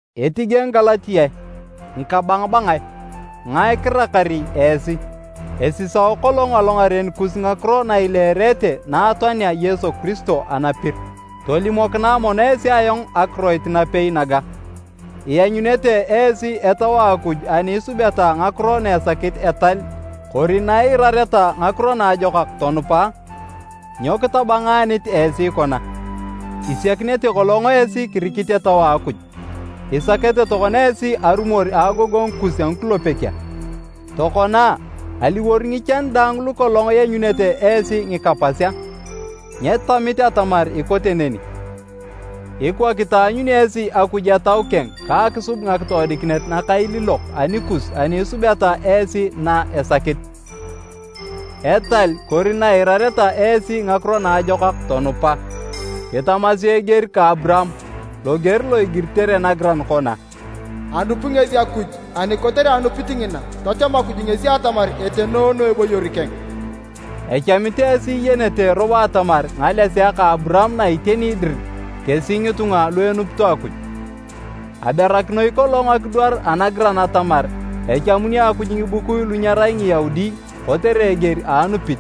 Etige Ngigalatiae, ngikabangabangae! Ngae kirakari esi? Esisao kolong alongaren kus ngakiro na ileerete na atoanea Yesu Kiristo anapir! Tolimokinae mono esi ayong akiroit napei naga, ianyunete esi Etau a Akuj ani isubeta ngakiro na esakit etal kori na iirareta ngakiro naajokak tonupa? Nyo kitabangaanit esi kona? Isiakinete kolong esi kirikit Etau a Akuj, isakete tokona esi arumor a agogongu kus a ngikulepek a? Tokona, aliwor ngichan daang lukolong ianyunete esi ngika pas a? Nyetamit atamar ikote neni! Ikwa kitaanyuni esi Akuj Etau keng ka akisub ngakitoodikinet nakailiilok anikus ani isubeta esi na esakit, etal kori na iirareta esi ngakiro naajokak tonupa? Kitamasi eger ka Aburaam, loger lo igiritere nagiran kona, “Anupi ngesi Akuj ani kotere anupit ngina, tacham Akuj ngesi atamar etenoono eboyor keng.” Echamit esi iyenete robo atamar ngalesea ka Aburaam na iteni dir kesi ngitunga lu enupito Akuj. Aberakinoi kolong akidwar anagiran atamar echamuni Akuj ngibukui lu nyerai Ngiyaudi kotere eger a anupit.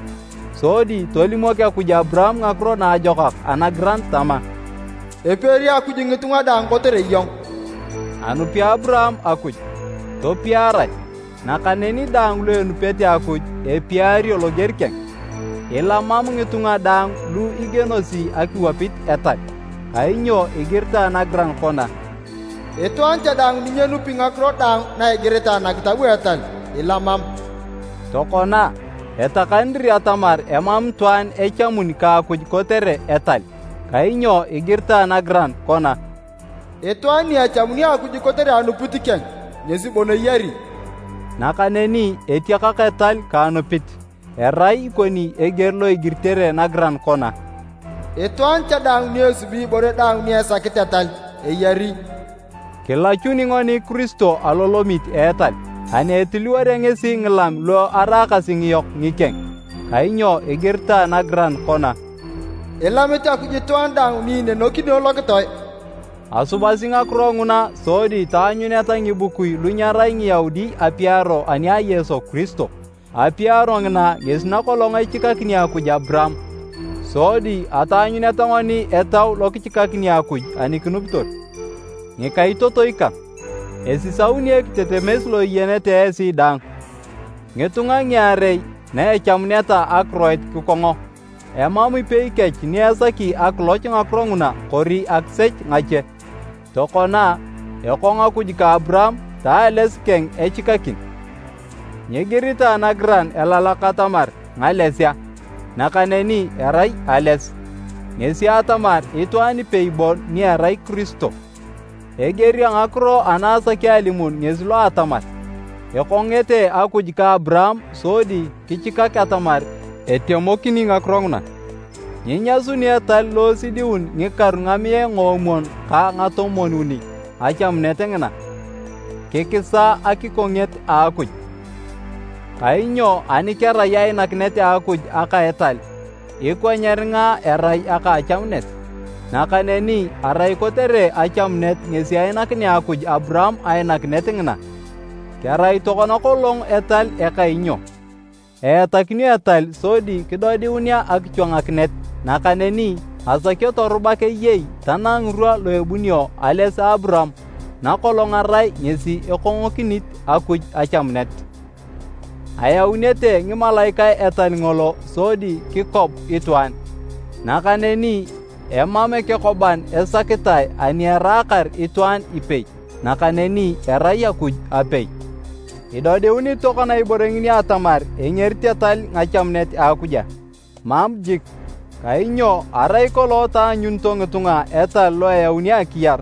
Sodi tolimok Akuj Aburaam Ngakiro Naajokak anagiran tama, “Epiari Akuj ngitunga daang kotere iyong.” Anupi Aburaam Akuj, topiarae, nakaneni daang lu enupete Akuj, epiario loger keng. Ilamam ngitunga daang lu igienosi akiwapit etal, kainyo igiritae nagiran kona, “Itwaan cha daang ni nyenupi ngakiro daang na igiritae nakitab a etal, ilamam!” Tokona, etakani dir atamar emam itwaan echamun ka Akuj kotere etal. Kainyo igiritae nagiran kona, “Itwaan ni echamuni Akuj kotere anupit keng, ngesi bon eyari.” Nakaneni etiakak etal ka anupit. Erai ikoni eger lo igiritere nagiran kona, “Itwaan cha daang ni esubi ibore daang ni esakit etal, eyari.” Kilachuni ngoni Kiristo alolamit a etal, ani etiliworea ngesi ngilam lu araakasi ngiyok ngikeng, kainyo igiritae nagiran kona, “Ilamit Akuj itwaan daang ni inenekino lokitoe.” Asubasi ngakiro nguna sodi taanyuneta ngibukui lu nyerai Ngiyaudi apiaro ani a Yesu Kiristo. Apiaro ngina ngesi nakolong echikakini Akuj Aburaam, sodi ataanyuneta ngoni Etau lokichikakini Akuj ani kinupitor. Ngikaitotoi kang, esisauni ekitetemes lo iyenete esi daang, ngitunga ngiarei na echamuneta akiroit kikongo, emam ipei kech ni esaki akiloch ngakiro nguna kori akisech ngache. Tokona, ekong Akuj ka Aburaam ta ales keng echikakin. Nyigiritae nagiran elalak atamar, “Ngalesea”, nakaneni erai, “ales”, ngesi atamar itwaan ipei bon ni erai Kiristo. Eger a ngakiro ana asaki alimun ngesi lo atamar, ekongete Akuj ka Aburaam sodi kichikak atamar etemokini ngakiro nguna. Nyinyasuni etal lo esidiun ngikaru ngamiae ngoomwon ka ngatomwon-uni achamunet ngina, kikisa akikonget a Akuj. Kainyo ani kerai ainakinet a Akuj aka etal, ikwa nyeringa erai aka achamunet. Nakaneni, arai kotere achamunet ngesi ainakinea Akuj Aburaam ainakinet ngina. Kerai tokona kolong etal eka inyo? Eatakinio etal sodi kidodiunea akichwangakinet nakaneni asakio torubak eyei tanang ngirwa lu ebunio ales a Aburaam nakolong arai ngesi ekongokinit Akuj achamunet. Ayaunete ngimalaikae etal ngolo sodi kikob itwaan. Nakaneni emam ekekoban esakitae ani eraakar itwaan ipei, nakaneni erai Akuj apei. Idodiunit tokona ibore ngini atamar engerit etal ngachamunet a Akuj a? Mam jik! Kainyo arai kolong taanyunito ngitunga etal lo eyauni akiyar,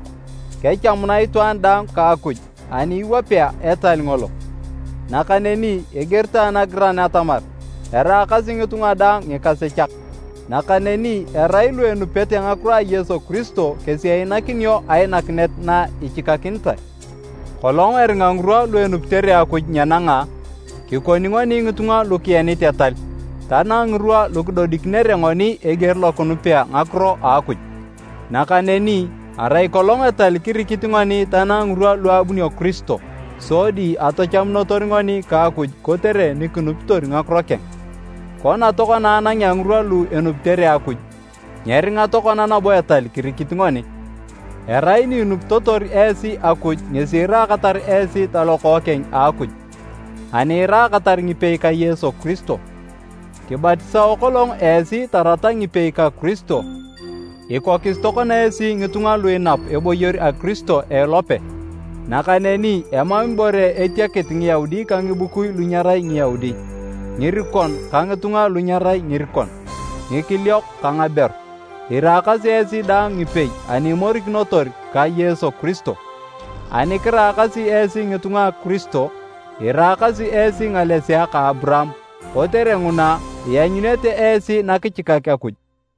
kechamuna itwaan daang ka Akuj ani iwapea etal ngolo. Nakaneni igiritae nagiran atamar eraakasi ngitunga daang ngikasechak, nakaneni erai lu enupete ngakiro a Yesu Kiristo kesi einakinio ainakinet na ichikakinitae. Kolong eringa ngirwa lu enupitere Akuj nyenanga, kikoni ngoni ngitunga lu kienit etal, tanang ngirwa lukidodikinere ngoni eger lo kinupea ngakiro a Akuj. Nakaneni arai kolong etal kirikit ngoni tanang ngirwa lu abunio Kiristo, sodi atachamunotor ngoni ka Akuj kotere nikinupitor ngakiro keng. Kona tokona anangea ngirwa lu enupitere Akuj, nyeringa tokona nabo etal kirikit ngoni. Erai ni inupitotor esi Akuj ngesi iraakatar esi talokookeng a Akuj, ani iraakatar ngipei ka Yesu Kiristo. Kibatisao kolong esi tarata ngipei ka Kiristo, ikokis tokona esi ngitunga lu inap eboyor a Kiristo a elope. Nakaneni emam ibore etiakit Ngiyaudi ka ngibukui lu nyerai Ngiyaudi, ngirikon ka ngitunga lu nyerai ngirikon, ngikiliok ka ngaberu, iraakasi esi daang ngipei ani imorikinotor ka Yesu Kiristo. Ani kiraakasi esi ngitunga a Kiristo, iraakasi esi ngalesea ka Aburaam, kotere nguna, ianyunete esi nakichikak Akuj.